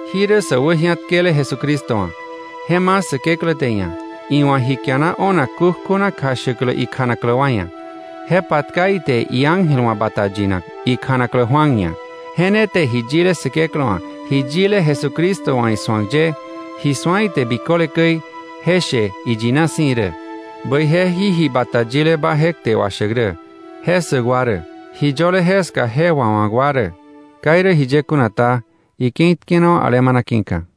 Jí rä sä wäji̱atkele Jesucristo wa̱. Je ma̱ Säkeklä te iia̱, iwa̱ ji kiana o̱nak kukjuna kjashäklä ikjanaklä wa ia̱. Je patka ite iángel wa̱ bata yinak, ikjanaklä Juan ia̱. Je ne te ji yile Säkeklä wa̱, ji yile Jesucristo wa̱ isu̱ak ye, ji su̱a ite biköle käi, je she iyina si̱ irä. Bäije jí ji bata yileba je kte washäk rä, je ssäk wa rä, ji yöle jeska je wawa̱k wa rä. Ka irä jiye kuna ta, ike̱i tkenawa̱ alemana ki̱ka.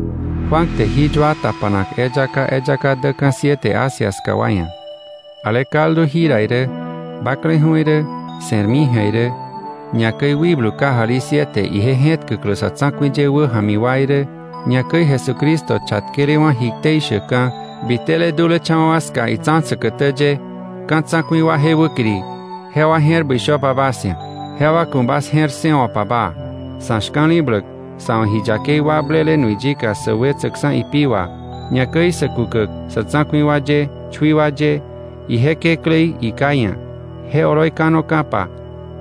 Juan te jí yua tapanak eyaka eyaka däka̱ siete Asia ska wa ia̱. Ale kaldu jira irä, bakleju̱ irä, se̱rmi ji̱a irä, ñakäi Wikblu kajali siete ije je̱tkäklä sa̱ tsa̱ku̱i ye wäja̱mi wa irä, ñakäi Jesucristo chatkelewa̱ ji ktei shäkka̱, bitele dulecha̱wa̱ wa ska itsa̱ säkätä ye, ka̱ tsa̱ku̱i wa je wäkiri, jewa je̱r bäi shöpa bas ia̱, jewa ku̱ bas je̱r ssëwo̱pa baa. Sa̱ shka̱li̱bläk, sa̱ wa̱ ji yakei wakblele nui yika sä wetsäkksa̱ ipi wà, ñakäi sä kukäk sa̱ tsa̱ku̱i wa ye, chui wa ye, ije Kekläí iKá ia̱, je oloi kanoka̱pa,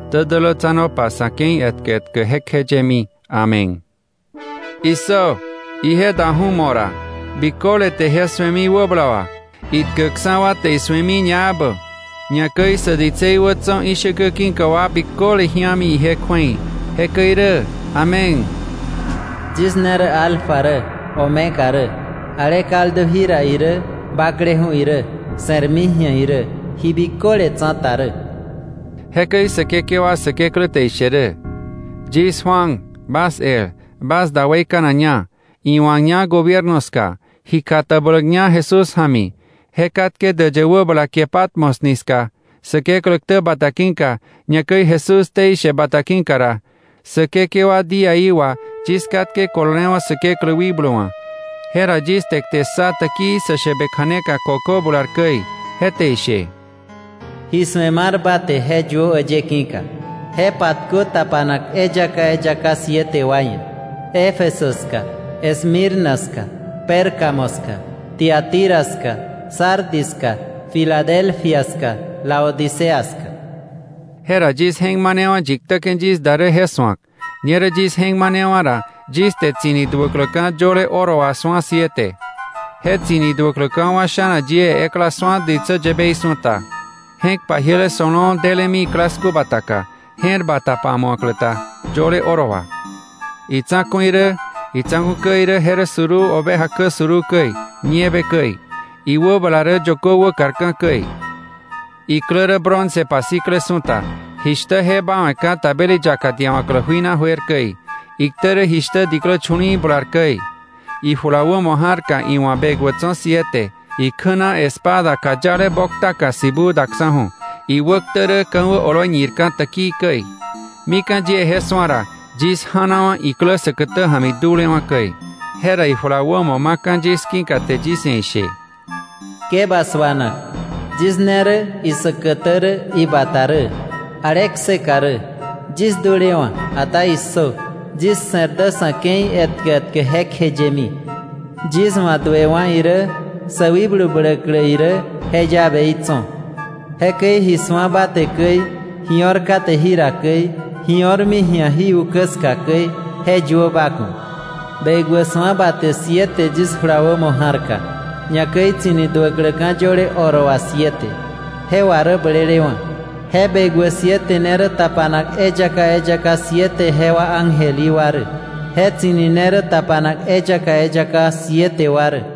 ktä dälätsanopa sa̱ ke̱i etkä etkä jekjeyemi! Amén. ¡Issö, ije daju̱ mo̱ ra! Biköle te je su̱emi wäbala wà, itkäkksa̱ wa te isu̱emi ñaebä. Ñakäi sä ditsei wä tso̱ ishäkä ki̱ka wa biköle ji̱ami ije kju̱ei. Jekäi irä. Amén. “Yis ne rä ‘Alfa’ rä, ‘Omega’ rä, ale kaldu jira irä, bakleju̱ irä, se̱rmi ji̱a irä, ji biköle tsa̱ta rä”, jekäi Säkekewa Säkeklä te ishe rä. Yis Juan, bas el, bas da weikanakña, iwa̱kña gobierno ska, ji katabläkña Jesús ja̱mi, je katke däyë wäbala kie Patmos ni ska Säkeklä ktä bata ki̱ka, ñakäi Jesús ktei she bata ki̱ka ra, Säkekewa día í wà yis katke kololewa̱ Säkeklä wikblu wa̱, jera yis te kte ssa täkii sä shäbe kja̱neka kökö bular käi, je te ishe: “Ji su̱e mar ba te je yuö äyë ki̱ka, je patkö tapanak eyaka eyaka siete wa ia̱: Éfeso ska, Esmirna ska, Pérgamo ska, Tiatira ska, Sardis ska, Filadelfia ska, Laodicea ska.” Jera yis je̱k manewa̱ yi ktäke̱ yis da rä je su̱ak. Ñerä yis je̱k manewa̱ ra, yis te tsi̱ni duäkläka̱ yöle oro wà su̱a siete. Je tsi̱ni duäkläka̱ wa sha̱na yie ekla su̱a ditsä yäbei su̱ta, je̱k pajiele so̱lo̱o̱ delemi iklasku bataka, je̱r bata pamu̱aklä ta yöle oro wà. Itsa̱ku̱ irä, itsa̱ku̱ kä irä je rä suruu oveja kä suruu käi, nieve käi; iwäbala rä yökö wäkarka̱ käi; iklä rä bronce pasikle su̱ta, jishtä je báwe̱ka̱ tabeli yaka diawa̱klä jui na juer käi; iktä rä jishtä diklä chu̱li̱i̱ bular käi. Ijula wämo ja̱rka iwa̱ bekwä tso̱ siete, ikjä na espada kayale boktaka sibuu daksa̱ju̱, iwäktä rä ka̱wä oloi ñirka̱ täkii käi. Mika̱ yie je su̱a ra, yis ja̱nawa̱ iklä säkätä ja̱mi dulewa̱ käi. Jera ijula wämo maka̱ yis ki̱ka te yis ia̱ ishe: “Ke ba suanak; yis ne rä isäkätä rä, ibata rä, ale kseka rä. Yis dulewa̱, ata issö, yis se̱r dä sa̱ ke̱i etkä etkä jekjeyemi. Yis wa̱ duewa̱ irä sä wikblu bläklä irä, je llaveí tso̱. Jekäi ji su̱a ba te käi, ji o̱r kate jira käi, ji o̱rmi ji̱a jí ukä ska käi, je yuö ba ku̱. Bekwä su̱a ba te siete yis jula wämo ja̱rka, ñakäi tsi̱ni duäkläka̱ yöle oro wà siete, jewa rä blelewa̱. Je bekwä siete ne rä tapanak eyaka eyaka siete jewa ángel í wa rä. Je tsi̱ni ne rä tapanak eyaka eyaka siete wa rä.